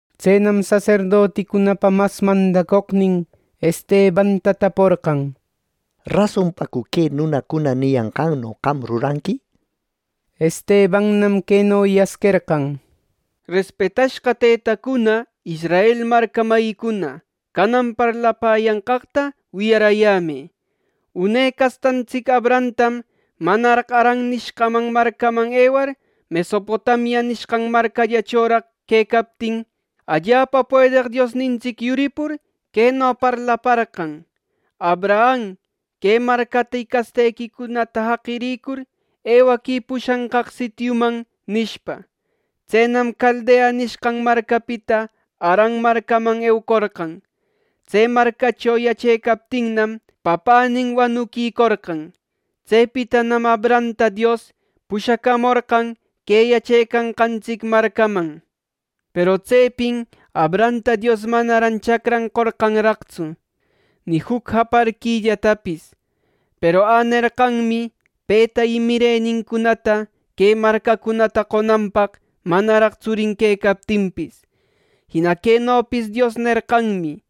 Tsenam saserdoticunapa mas mandacoqnin Estebanta taporqan: —¿Rasonpacu que nunacuna niyanqanno qam ruranqui? —nishpa. Estebannam queno yasquerqan: “Respetashqa tëtacuna y israel marca mayicuna, canan parlapäyanqaqta wiyaräyämë: Une castantsic Abrahamtam manaraq Haran nishqan marcaman ewar, Mesopotamia nishqan marcallachoraq quecaptin, allapa puedeq Diosnintsic yuripur, queno parlaparqan: ‘Abraham, que marcata y castequicunata jaqirïcur, ewaquï pushanqaq sitiuman’ nishpa. Tsenam Caldea nishqan marcapita Haran marcaman eucorqan. Tse marcacho yachecaptinnam, papänin wanuquicorqan. Tsepitanam Abrahamta Dios pushacamorqan que yachecanqantsic marcaman. Peru tsepin Abrahamta Dios manaran chacran qorqanraqtsu, ni juc japarquillatapis. Peru änerqanmi peta y mirenincunata que marcacunata qonanpaq, manaraq tsurin quecaptinpis. Jina quenopis Dios nerqanmi: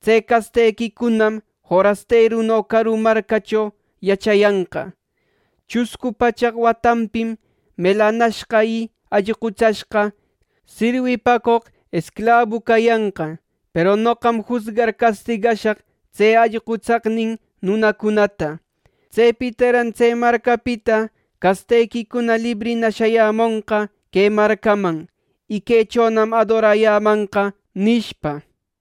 ‘Tse castequicunam forasteruno caru marcacho yachayanqa; chuscu pachaq watanpim melanashqa y allqutsashqa sirwipacoq esclabu cayanqa. Peru noqam jusgar castigashaq tse allqutsaqnin nunacunata. Tsepitaran tse marcapita castequicuna librina shayämonqa que marcaman, y quechonam adorayämanqa’ nishpam.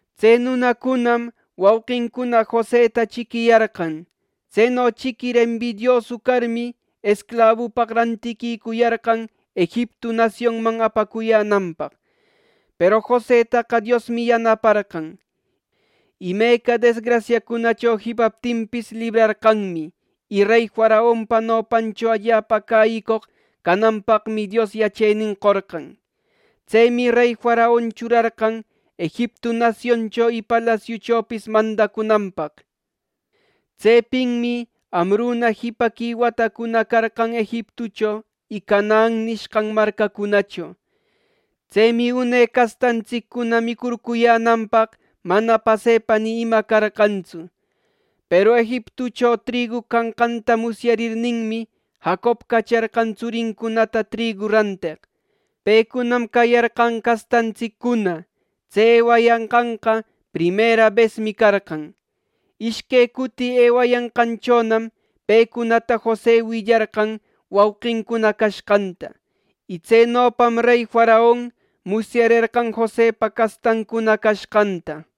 “Tse nunacunam wauqincuna Joseta chiquiyarqan. Tseno chiquir embidiosu carmi, esclabupaq rantiquicuyarqan Egiptu nasionman apacuyänanpaq. Peru Josetaqa Diosmi yanaparqan, imeca desgrasiacunacho jipaptinpis, librarqanmi. Y rey faraonpa nopancho allapa cäyicoq cananpaqmi, Dios yachenin qorqan. Tsemi rey faraon churarqan Egiptu nasioncho y palasiuchopis mandacunanpaq. “Tsepinmi amruna jipaqui watacuna carqan Egiptucho y Canaan nishqan marcacunacho. Tsemi une castantsiccuna micurcuyänanpaq mana pasepa ni ima carqantsu. Peru Egiptucho trigu canqanta musyarirninnam, Jacob cacharqan tsurincunata trigu ranteq. ˻Pecunam cayarqan castantsiccuna.˼ Tse ewayanqanqa primera besmi carqan. Ishque cuti ewayanqanchonam pecunata Jose willarqan wauqincuna cashqanta. Y tsenopam rey faraon musyarerqan Josepa castancuna cashqanta.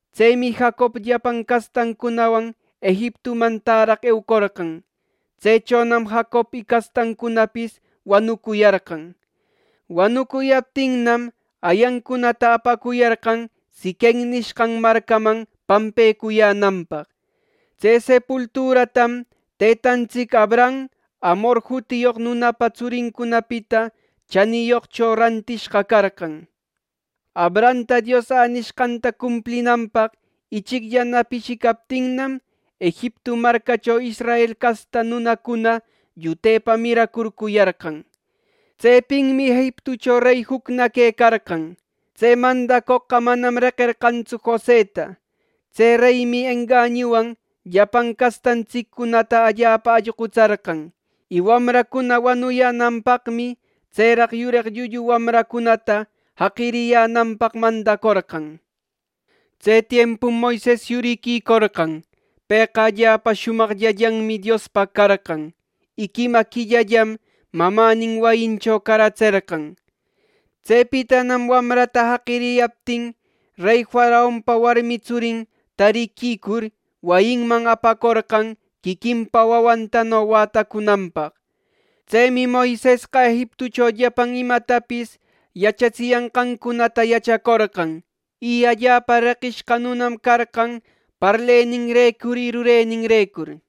Tsemi Jacob llapan castancunawan Egiptuman täraq eucorqan. Tsechonam Jacob y castantsiccunapis wanucuyarqan. Wanucuyaptinnam, ayancunata apacuyarqan Siquem nishqan marcaman pampecuyänanpaq. Tse sepulturatam tëtantsic Abraham Hamor jutiyoq nunapa tsurincunapita chaniyoqcho rantishqa carqan. “Abrahamta Dios änishqanta cumplinanpaq ichicllana pishicaptinnam, Egiptu marcacho Israel casta nunacuna llutepa miracurcuyarqan. Tsepinmi Egiptucho rey jucna quecarqan. Tse mandacoqqa manam reqerqantsu Joseta. Tse reymi engañuwan llapan castantsiccunata allapa allqutsarqan; y wamracuna wanuyänanpaqmi tseraq yureq llullu wamrancunata jaqiriyänanpaq mandacorqan. Tse tiempum Moises yuriquicorqan. Pëqa allapa shumaqllallanmi Diospaq carqan. Y quima quillallam mamänin wayincho caratserqan. Tsepitanam wamrata jaqiriyaptin, rey faraonpa warmi tsurin tariquicur, wayinman apacorqan quiquinpa wawantano wätacunanpaq. Tsemi Moisesqa Egiptucho llapan imatapis yachatsiyanqancunata yachacorqan; y allapa reqishqa nunam carqan parleninrecur y rureninrecur.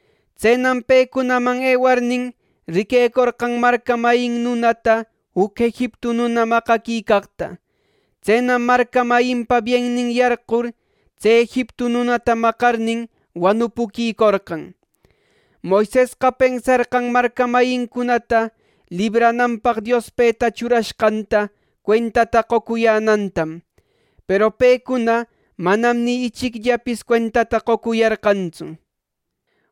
Tsenam pecunaman ewarnin, riquecorqan marca mayin nunata juc Egiptu nuna maqaquicaqta. Tsenam marca mayinpa biennin yarqur tse Egiptu nunata maqarnin wanupuquicorqan. Moisesqa pensarqan marca mayincunata librananpaq Dios peta churashqanta cuentata qocuyänantam; peru pecuna manam ni ichicllapis cuentata qocuyarqantsu.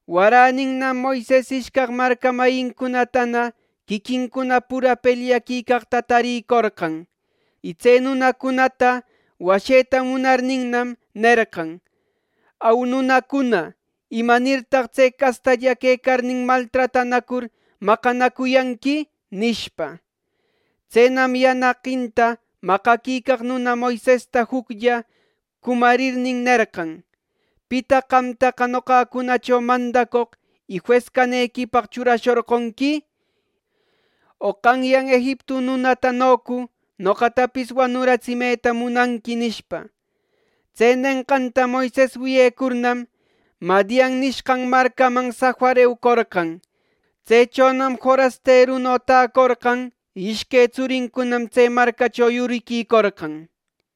Waräninnam Moises ishcaq marca mayincunatana quiquincuna pura pelyaquicaqta tarïcorqan. Y tse nunacunata washeta munarninnam, nerqan: ‘Au, nunacuna, ¿imanirtaq tse castalla quecarnin, maltratanacur maqanacuyanqui?’ nishpa. Tsenam yanaqinta maqaquicaq nuna Moisesta juclla cumarirnin, nerqan: ‘¿Pitaq qamtaqa noqacunacho mandacoq y jues canequipaq churashorqonqui? ¿O qanyan Egiptu nunatanocu noqatapis wanuratsimeta munanqui?’ nishpa. Tse nenqanta Moises wiyecurnam, Madian nishqan marcaman safar eucorqan. Tsechonam forasteruno täcorqan y ishque tsurincunam tse marcacho yuriquicorqan.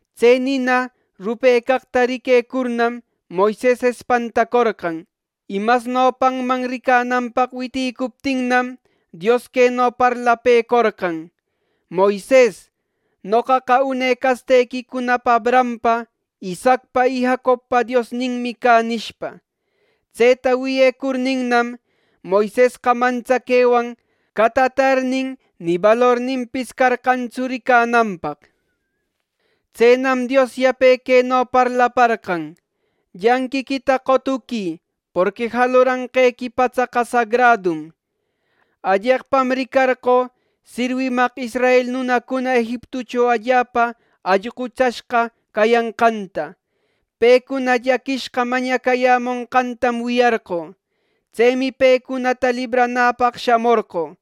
Tse nina rupecaqta riquecurnam, Moises espantacorqan. Y mas nopanman ricananpaq witïcuptinnam, Dios queno parlapëcorqan: ‘Moises, noqaqa une castequicuna Abrahampa, Isaacpa y Jacobpa Diosninmi cä’ nishpa. Tseta wiyecurninnam, Moisesqa mantsaquewan catatarnin, ni balorninpis carqantsu ricananpaq. Tsenam Dios yape queno parlaparqan: ‘Llanqiquita qotuquï; porqui jaluranqequi patsaqa sagradum. Alleqpam ricarqö sirwimaq israel nunacuna Egiptucho allapa allqutsashqa cayanqanta. Pecuna llaquishqa mañacayämonqantam wiyarqö. Tsemi pecunata libranäpaq shamorqö.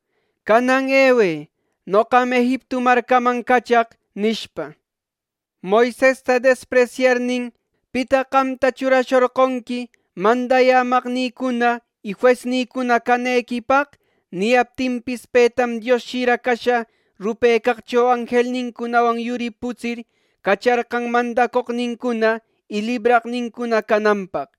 Canan ewë, noqam Egiptu marcaman cachaq’, nishpa. “Moisesta despresyarnin ‘¿Pitaq qamta churashorqonqui mandayämaqnïcuna y juesnïcuna canequipaq?’ nicayaptinpis, petam Dios shira casha rupecaqcho anjelninwan yuriputsir, cacharqan mandaqnincuna y libraqnincuna cananpaq.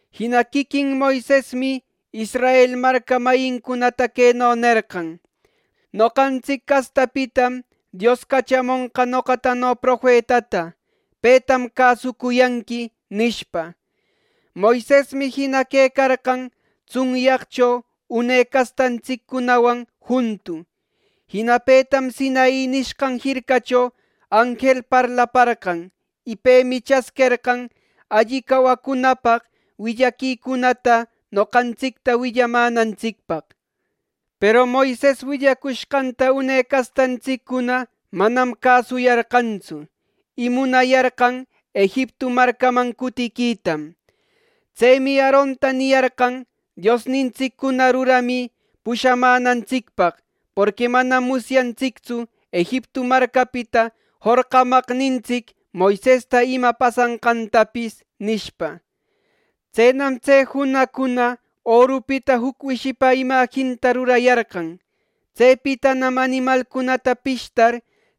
Jina quiquin Moisesmi Israel marca mayincunata queno nerqan: ‘Noqantsic castapitam Dios cachamonqa noqatano profetata; ˻petam cäsuyanqui˼’ nishpa. Moisesmi jina quecarqan tsunyaqcho une castantsiccunawan juntu. Jina petam Sinai nishqan jircacho anjel parlaparqan. Y pemi chasquerqan alli cawacunapaq willaquicunata noqantsicta willamänantsicpaq. “Peru Moises willacushqanta une castantsiccuna manam cäsuyarqantsu. Y munayarqan Egiptu marcaman cutiquitam. Tsemi Aaronta niyarqan: ‘Diosnintsiccuna ruramï pushamänantsicpaq; porqui manam musyantsictsu Egiptu marcapita jorqamaqnintsic Moisesta ima pasashqantapis’ nishpa. Tsenam tse junaqcuna orupita juc wishipa imajinta rurayarqan. Tsepitanam animalcunata pishtar,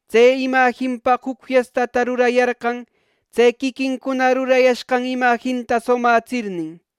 tse imajinpaq juc fiestata rurayarqan, tse quiquincuna rurayashqan imajinta sumätsirnin.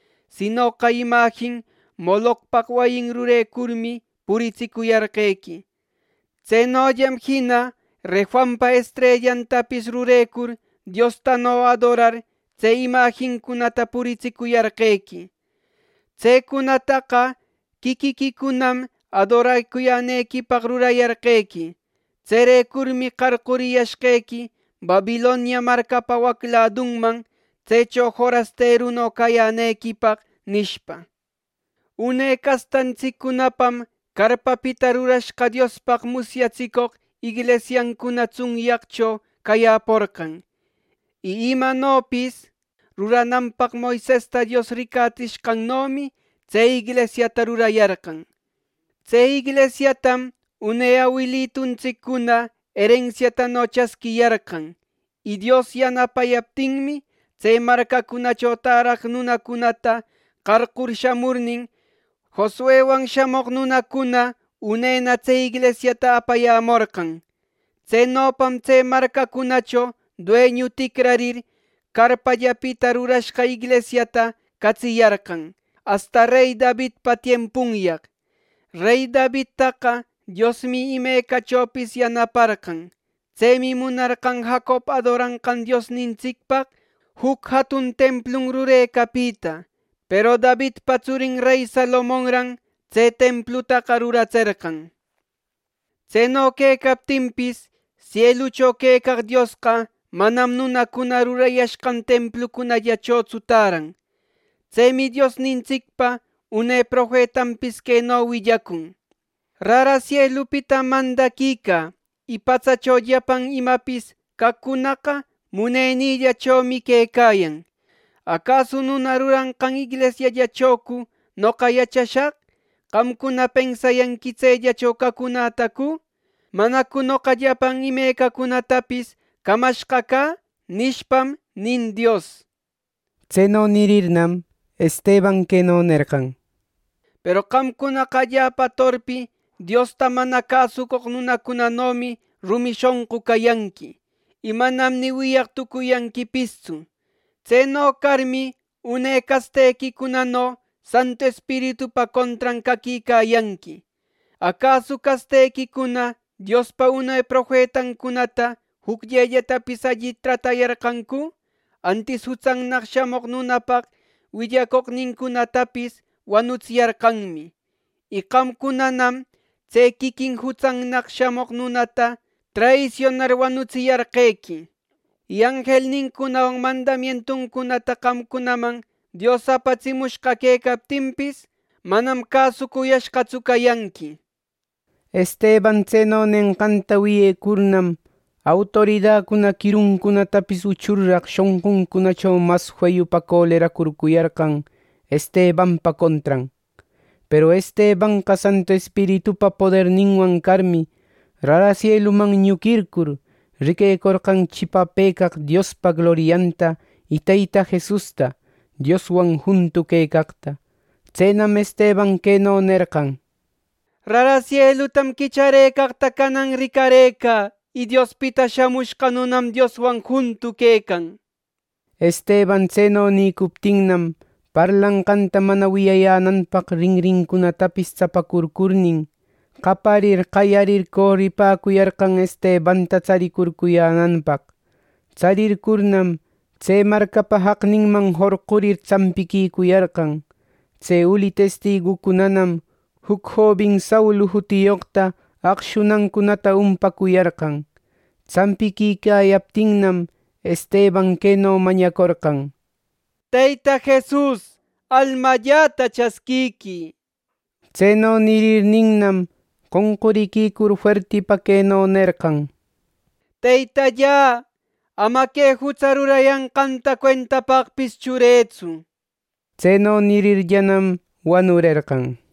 sinoqa imajin Molocpaq wayin rurecurmi, puritsicuyarqequi. Tsenollam jina Refanpa estrellantapis rurecur, diostano adorar, tse imajincunata puritsicuyarqequi. Tsecunataqa quiquiquicunam adoracuyänequipaq rurayarqequi. Tserecurmi qarquriyashqequi Babilonia marcapa wac ladunman, tsecho forasteru cayänequipaq’ nishpa. “Une castantsiccunapam carpapita rurashqa Diospaq musyatsicoq inglisiancuna tsunyaqcho cayäporqan. Y imanopis rurananpaq Moisesta Dios ricatsishqannomi, tse inglisiata rurayarqan. Tse inglisiatam une awiluntsiccuna erensiatano chasquiyarqan. Y Dios yanapayaptinmi, tse marcacunacho täraq nunacunata qarqur shamurnin, Josuewan shamoq nunacuna unena tse inglisiata apayämorqan. Tsenopam tse marcacunacho dueñu ticrarir, carpallapita rurashqa inglisiata catsiyarqan, asta rey Davidpa tiempunyaq. Rey Davidtaqa Diosmi imecachopis yanaparqan. Tsemi munarqan Jacob adoranqan Diosnintsicpaq juc jatun templun rurecapita. Peru Davidpa tsurin rey Salomonran tse templutaqa ruratserqan. Tseno quecaptinpis, sielucho quecaq Diosqa manam nunacuna rurayashqan templucunallachotsu täran. Tsemi Diosnintsicpa une profetanpis queno willacun: ‘Rara sielupitam mandaquicä; y patsacho llapan imapis caqcunaqa munenïllachomi quecayan. ¿Acasu nuna ruranqan inglisiallachocu noqa yachashaq! ¿Qamcuna pensayanqui tsellacho cacunätacu! ¿Manacu noqa llapan imecacunatapis camashqa cä!’ nishpam, nin Dios.” Tseno nirirnam, Esteban queno nerqan: “Peru qamcunaqa allapa torpi Diosta mana cäsoq nunacunanomi rumi shonqu cayanqui; y manam ni wiyaq tucuyanquipistsu. Tseno carmi, une castequicunano Santu Espiritupa contran caquicayanqui. ¿Acasu castequicuna Diospa une profetancunata jucllellatapis alli tratayarqancu! Antis Jutsannaq Shamoq nunapaq willacoqcunatapis wanutsiyarqanmi. Y qamcunanam tse quiquin Jutsannaq Shamoq nunata traisionar, wanuratsiyarquequi. Y anjelnincunawan mandamientuncunata qamcunaman Dios apatsimushqa quecaptinpis, manam cäsucuyashqatsu cayanqui” nir. Esteban tseno nenqanta wiyecurnam, autoridacuna quiruncunatapis uchurraq shonquncunacho mas feyupa coleracurcuyarqan Estebanpa contran. Peru Estebanqa Santu Espiritupa poderninwan carmi, rara sieluman ñuquircur, riquecorqan chipapëcaq Diospa glorianta y Teyta Jesusta Dioswan juntu quecaqta. Tsenam Esteban queno nerqan: —Rara sielutam quicharëcaqta canan ricarëcä, y Diospita Shamushqa Nunanam Dioswan juntu quecan. Esteban tseno nïcuptinnam, parlanqanta mana wiyayänanpaq rinrincunatapis tsapacurcurnin, qaparir qayarir coripäcuyarqan Estebanta tsaricurcuyänanpaq. Tsarircurnam, tse marcapa jacninman jorqurir tsampiquicuyarqan. Tse uli testigucunanam juc jobin Saulu jutiyoqta acshunancunata umpacuyarqan. Tsampiquicayaptinnam, Esteban queno mañacorqan: —Teyta Jesus, almalläta chasquiquï. Tseno nirirninnam, qonquriquicur, fuertipa queno nerqan: —¡Teytallä, ama que jutsa rurayanqanta cuentapaqpis churëtsu! Tseno nirirllänam, wanurerqan.